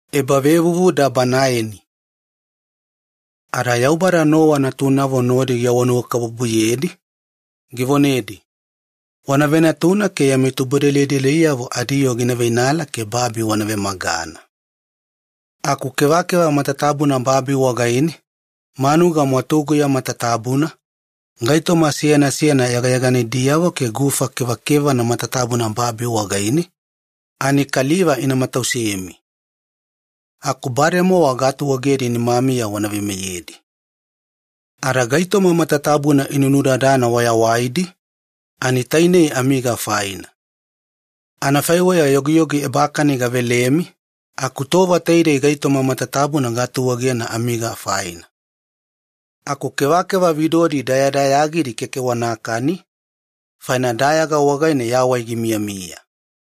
Yaubada yana veyavo Nowa nodi. Ada Yaubada Nowa natunavo nodi givonanuwakabubuyedi, givonedi, “Wanavenatuna ke yami tubudelideliyavo adiyoo gina veinala ke babi wana vemagana. Aku kevakeva matatabuna babi wagaine, manuga mwatuguya matatabuna, gaitoma seyana seyana yagayaganidiyavo ke gufa kevakevana matatabuna babi wagaine, ani kaliva ina matausemi. Aku bademowa gaatuegedi nimamiya wana veimeyedi. Ada gaitoma matatabuna inunudadana wayawaidi tainei amiga faina. Anafaiweya yogiyogi ebakani gavelemi, aku tova taidei gaitoma matatabuna gaatuegena amiga faina. Aku kevakeva vidodi dayadayagidi keke wanakani, faina dayaga wagaine yawai gimiyamiya.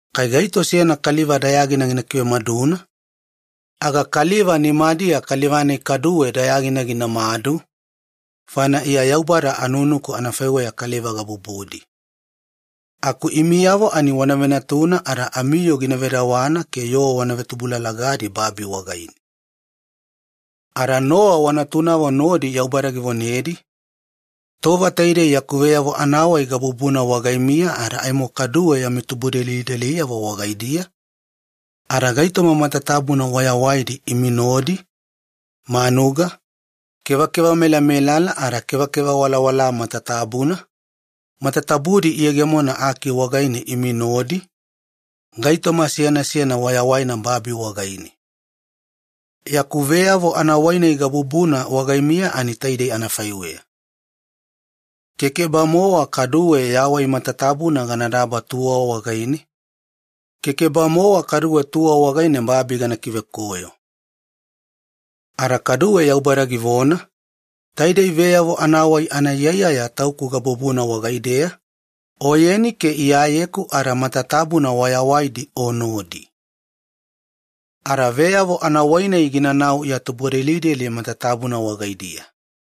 Kai gaito seyana kaliva dayagina gina kivemaduna, kaliva-nai kaduwe dayagina ginamadu kaliva wagaidiya, faina iya Yaubada anunuku anafaiweya kaliva gabubudi. Aku imiyavo ani wana venatuna ada amiyoo gina vedawana ke yoo wana vetubulalagidi babi wagaine.” Ada Nowa wanatunavo nodi Yaubada givonedi, “Tova taidei yaku veyavo anavonadabadaba gasena wagaimiya ada aimo kaduwe yami tubudelideliyavo wagaidiya, ada gaitoma matatabuna wayawaidi imi nodi: manuga, kevakeva melamelala ada kevakeva walawalaa matatabuna, matatabu-moedi iyegemona aki wagaine imi nodi, gaitoma seyana seyana wayawaina babi wagaine. Yaku veyavo anavonadabadaba gasena wagaimiya taidei anafaiweya: kekeba-mowa kaduwe yawai matatabuna ganadaba tuwa wagaine, kekeba-mowa kaduwe tuwa wagaine babi gana luveyawaliye.” Ada kaduwe Yaubada givona, “Taidei veyavo-nai anaiyaiyaya tauku gabubuna wagaideya, oyeni ke iyayeku ada matatabuna wayawaidi o nodi. Ada veyavo anavonadabadaba-nai ginanau ya tubudelideli matatabuna wagaidiya.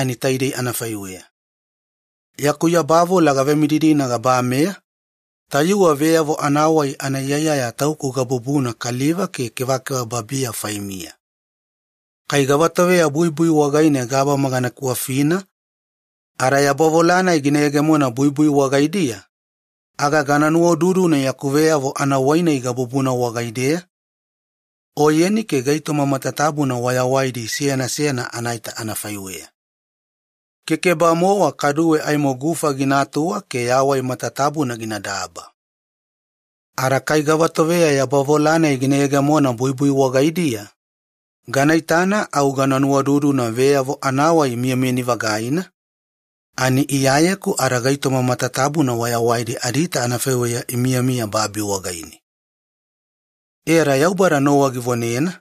Taidei anafaiweya, yaku yabavola gavemididina gabameya, tayuwe veyavo anaiyaiyaya tauku gabubuna kaliva ke kevakeva babiya faimiya. Kai gava toveya buibui wagaine gabama gana kiwafina ada yabavola-nai gina yegemona buibui wagaidiya, aga gana nuwaududuna yaku veyavo-nai gabubuna wagaideya, oyeni ke gaitoma matatabuna wayawaidi seyana seyana anaita anafaiweya. Kekeba-mowa kaduwe aimo gufa ginatuwa ke yawai matatabuna ginadaba. Ada kai gava toveya yabavola-nai gina yegemona buibui wagaidiya, gana itana au gana nuwaududuna veyavo miyamiyani-vagaina, ani Iyayeku ada gaitoma matatabuna wayawaidi adiita anafaiweya imiyamiya babi wagaine.” E ada Yaubada Nowa givonena,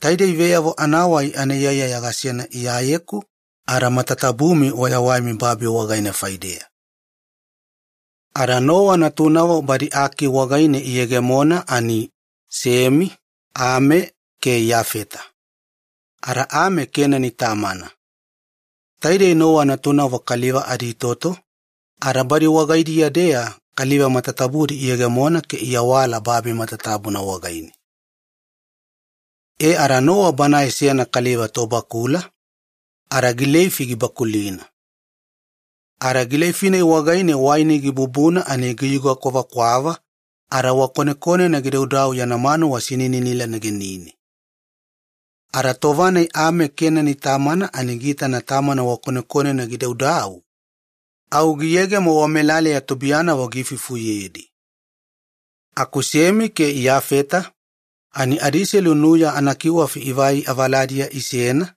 “Taidei veyavo anaiyaiyaya gasena Iyayeku ada matatabumi wayawaimi babi wagaine faideya.” Nowa natunavo. Ada Nowa natunavo badi aki wagaine iyegemona ani, Semi, Ami ke Iyafeta. Ada Ame Kenani tamana. Taidei Nowa natunavo kaliva aditoto, ada badi wagaidiya-deya kaliva matatabudi iyegemona ke iawala babi matatabuna wagaine. E ada Nowa banae seyana kaliva tobakula, ada gileifi gibakulina. Ada gileifi-nai wagaine waini gibububuna ani giyuga kwavakwava ada wakonekonena gidaudau yana manuwa sininila negenine. Ada tova-nai Ame Kenani tamana ani giitana tamana wakonekonena gidaudau, au giyegemo wamelaleya tubuiyanavo giifufuyedi. Aku Semi ke Iyafeta ani adiiselu nuya anakiwafi ivai avaladiya isena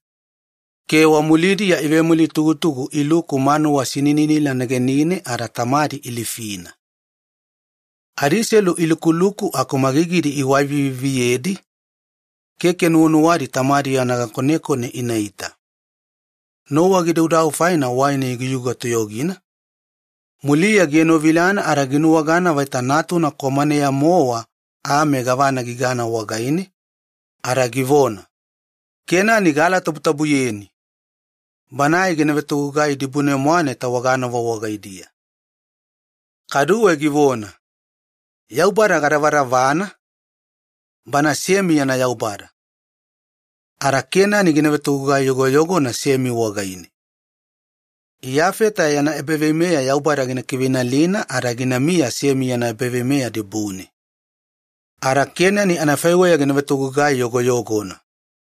ke wamulidiya ivemulitugutugu iluku manuwa sinininila negenine ada tamadi ilifina. Adiiselu ilukuluku aku magagidi iwaiviviyedi, keke nuwanuwadi tamadi yana gakonekone inaita. Nowa gidaudau faina waini giyuga toyogina, muliya gienovilana ada ginuwagana vaita natuna kwamaneya-mowa Ame gavana gigana wagaine, ada givona, “Kenani aalatabutabu! Una vetogugai dibune-mwane tawagamomo wagaidiya.” Kaduwe givona, “Yaubada kana vonanuwakabubuyena, Semi yana Yaubada! Ada Kenani gina vetogugai yogoyogona Semi wagaine. Iyafeta yana ebaveimeya Yaubada gina kiveinalina ada ginamiya Semi yana ebaveimeya dibune. Ada Kenani anafaiweya gina vetogugai yogoyogona.”